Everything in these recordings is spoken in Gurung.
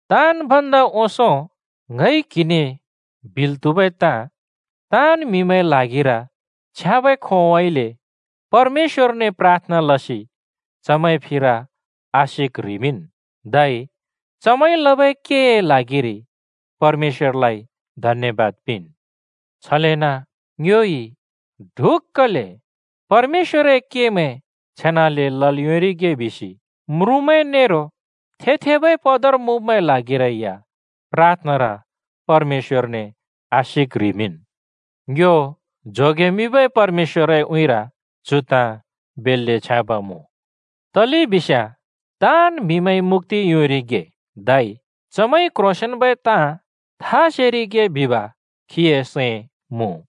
ताँन् भन्दा ओंसों ङइ क्हिने बिल् त्हुबै ताँ, ताँन् म्‍हिमैंए ल्हागिर छ्याँबै खोंउँइँले परमेश्‍वरने प्राथना लसि चमैंए फिर आशिक ह्रिंमिंन्। धै चमैंइ लबै केए ल्हागिरि परमेश्‍वरलाइ धन्‍यबाद पिंन्। छलेन ङ्योइ ढुक्‍कले परमेश्‍वरए केमैं छेनाले लल् योंरिगे बिसि म्रुँमैं नेरो थे-थेबै पदर मुँब्मैंए ल्हागिरै या प्राथनार परमेश्‍वरने आशिक ह्रिमिंन्। ङ्यो जोगेमिंबै परमेश्‍वरए उँइँर चु ताँ बेल्‍ले छ्याँब मुँ। तलेबिस्याँ ताँन् म्हिमैंइ मुक्‍ति योंरिगे धै चमैंइ क्ह्रोंसेंन्बै ताँ था सेरिगे बिब खीए सैं मुँ।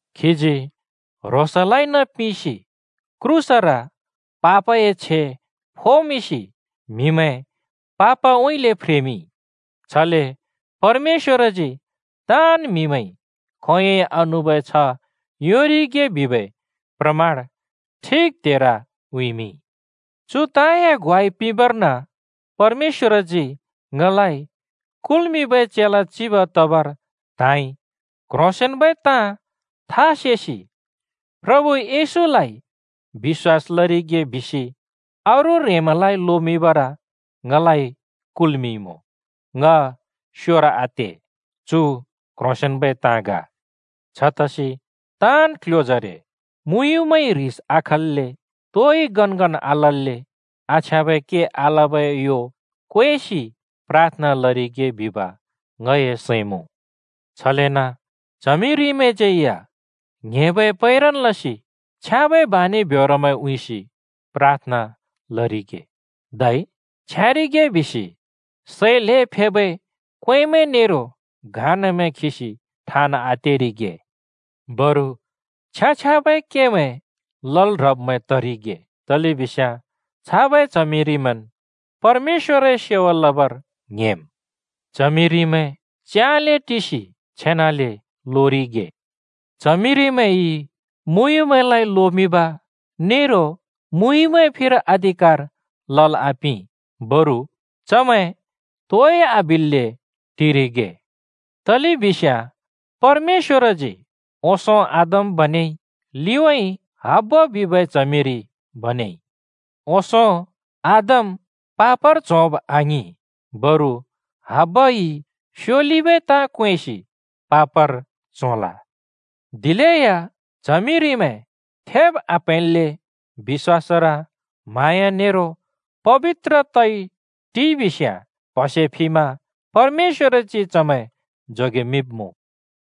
खीजी ह्रोंसलाइन पिंसि क्रूसर पापए छे फोमिंसि म्‍हिमैं पापउँइँले फ्रेमिंइ, छले परमेश्‍वरजी ताँन् म्हिमैंइ खोंयोंइ आनुबै छ्ह योंरिगे बिबै प्रमाण ठिक त्हेर उँइँमिंइ। चु ताँमैंए ग्वाइ पिंबर्न परमेश्‍वरजी ङलाइ कुल्मिंबै चेला चिब तबर त्हाँइ। क्ह्रोंसेंन्बै ताँ था सेसि प्रभु येशूलाइ बिश्‍वास लरिगे बिसि अरू ह्रेंमैंलाइ लोमिंबर ङलाइ कुल्मिंइमुँ। ङ स्‍योर आते, चु क्ह्रोंसेंन्बै ताँ ग। छतसि ताँन् क्ल्ह्‍योजरे मुँयुँमैंइ ह्रिस आखल्‍ले, तोइ गनगन आलल्‍ले आछ्याँबै के आलबै यो क्वेसि प्राथना लरिगे बिब ङए सैं मुँ। छलेन च्हमिरिमैंज्यै या ङ्‍हेंबै पैरन लसि, छ्याँबै बानि ब्योरमैं उँइँसि प्राथना लरिगे। धै छ्याँरिगे बिसि सै ल्हें फेबै क्वेंमैं नेरो घाँनामैं खिसि ठाँन् आतेरिगे। बरु छ्याँ-छ्याँबै केमैं लल् ह्रब्मैं तरिगे, तलेबिस्याँ छाबै च्हमिरिमैंन् परमेश्‍वरए सेवा लबर ङ्‍हेंम्। च्हमिरिमैंइ च्याँले टिसि छेनाले लोरिगे। च्हमिरिमैंइ मुँयुँमैंलाइ लोमिंब नेरो मुँयुँमैंए फिर अधिकार लल् आपिं। बरु चमैं तोइ आबिल्‍ले टिरिगे। तलेबिस्याँ परमेश्‍वरजी ओंसों आदम बनेइ, लिउँइँ हब्बा बिबै च्हमिरि बनेइ। ओंसों आदम पापर च्होब् आङिं, बरु हब्बाइ स्योलिबै ताँ क्वेंसि पापर च्होल। दिलेया च्हमिरिमैं थेब आप्हैंल्‍ले, बिश्‍वासर, म्हाँया नेरो पबित्र तइ टिइ बिस्याँ प्‍हसे फिमा परमेश्‍वरजी चमैं जोगेमिंब्मुँ।